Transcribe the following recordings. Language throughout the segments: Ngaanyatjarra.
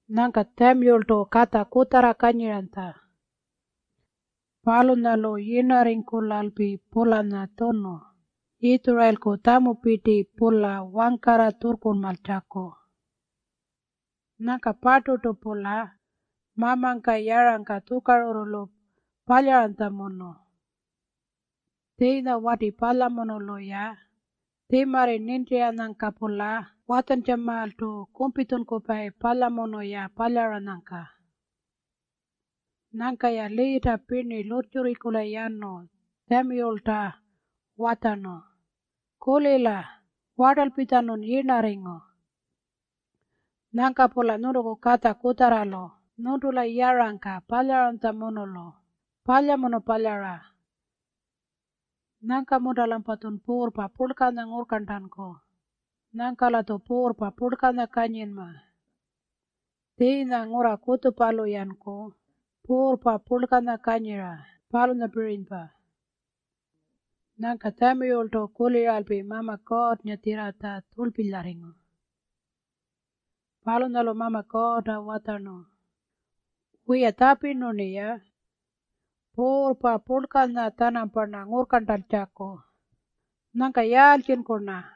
Nyangka Tjamiyultu katja kutjarra kanyiranytja. Palunyalu yirnarringkulalpi-pulanya tjunu Yitjurayilku tjamupirti-pula wangkarra tjurrkurlmaratjaku. Nyangka-parturtu-pula mamangka yarangka tjukarurrulu palyaranytjamunu. Tjiinya wati palyamunulu-ya tjimarri nintiranyangka-pula watjantjamaaltu kumpitjunkupayi palyamunu-ya palyaranyangka. Nyangka-ya liita pirni lurrtjurringkula yanu Tjamiyulta watjarnu, “Kulila. Wartalpitjanun yirnarringu. Nyangka-pula nyuntuku katja kutjarralu nyuntula yarangka palyaranytjamunulu palyamunu palyara. Nyangka-munta-lampatjun puurrpa purlkanya ngurrkarntanku? Nyangka-latju puurrpa purlkanya kanyinma, tjiinya ngurra kutjupalu-yanku puurrpa purlkanya kanyira, palunyapirinypa.” Nyangka Tjamiyultu kuliralpi Mama Kuurrngatjirratja tjurlpilyarringu. Palunyalu Mama Kuurrta watjarnu, “Wiya, tjapirnu-rniya puurrpa purlkanya-tjanamparna ngurrkarntankutjaku. Nyangka yaaltjinku-rna?”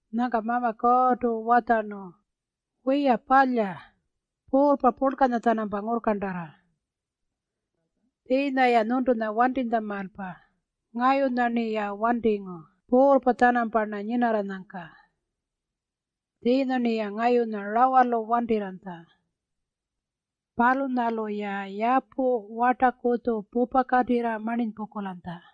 Nyangka Mama Kuurrtu watjarnu, “Wiya, palya. Puurrpa purlkanya-tjanampa ngurrkarntarra. Tjiinya-ya nyuntunya wantinytjamaalpa ngayunya-rniya wantingu puurrpa-tjanamparna nyinarranyangka. Tjiinya-rniya ngayunya rawalu wantirranytja. Palunyalu-ya yapu wartakutju pupakatirra marninypungkulanytja.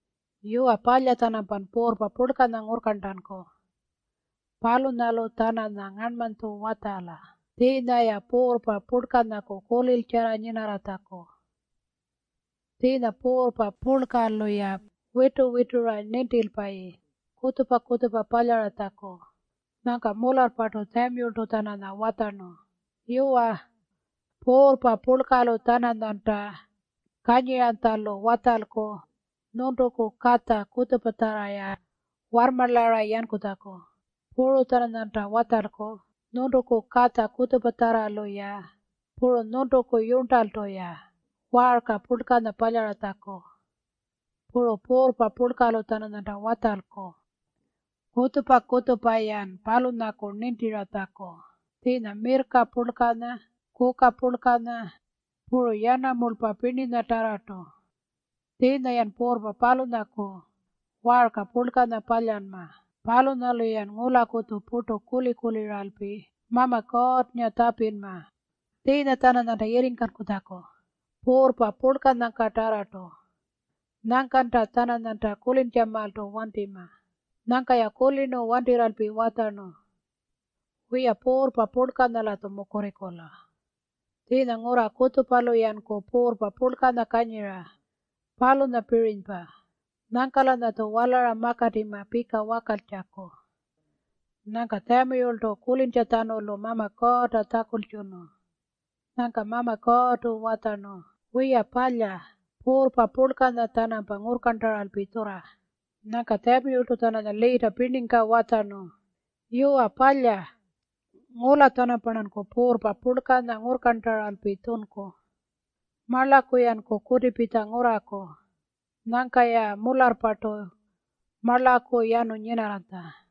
Yuwa, palya-tjanampan puurrpa purlkanya ngurrkarntanku. Palunyalu-tjananya ngarnmanytju watjala tjiinya-ya puurrpa purlkanyaku kuliltjarra nyinarratjaku. Tjiinya puurrpa purlkanyalu-ya witu-witura nintilpayi kutjupa-kutjupa palyaratjaku.” Nyangka mularrpartu Tjamiyultu-tjananya watjarnu, “Yuwa, puurrpa purlkalu-tjananyanta kanyiranytjalu watjalku nyuntuku katja kutjupatjarra-ya warrmarlara yankutjaku. Puru-tjananyanta watjalku nyuntuku katja kutjupatjarralu-ya puru nyuntuku yurntaltu-ya waarka purlkanya palyaratjaku. Puru puurrpa purlkalu-tjananyanta watjalku kutjupa-kutjupa-yan palunyaku nintiratjaku, tjiinya mirrka purlkanya, kuka purlkanya, puru yanamulpa pirninyatarrartu. Tjiinya-yan puurrpa palunyaku waarka purlkanya palyanma. Palunyalu-yan ngulakutju purtu kuli-kuliralpi Mama Kuurrnga tjapinma tjiinya-tjananyanta yirringkankutjaku puurrpa purlkangkatarrartu. Nyangkalta-tjananyanta kulintjamaaltu wantima.” Nyangka-ya kulirnu wantirralpi watjarnu, “Wiya, puurrpa purlkanyaku-latju mukurringkula. Tjiinya ngurra kutjupalu-yanku puurrpa purlkanya kanyira, palunyapirinypa. Nyangka-lanyatju walara makatima pika wakaltjaku.” Nyangka Tjamiyultu kulintjatjanulu Mama Kuurrta tjakultjunu. Nyangka Mama Kuurrtu watjarnu, “Wiya palya, puurrpa purlkanya-tjanampa ngurrkarntaralpi tjurra.” Nyangka Tjamiyultu-tjananya liita pirningka watjarnu, “Yuwa palya, ngula-tjanamparnanku puurrpa purlkanya ngurrkarntaralpi tjunku. Marlaku-yanku kutipitja ngurraku.” Nyangka-ya mularrpartu marlaku yanu nyinarranytja.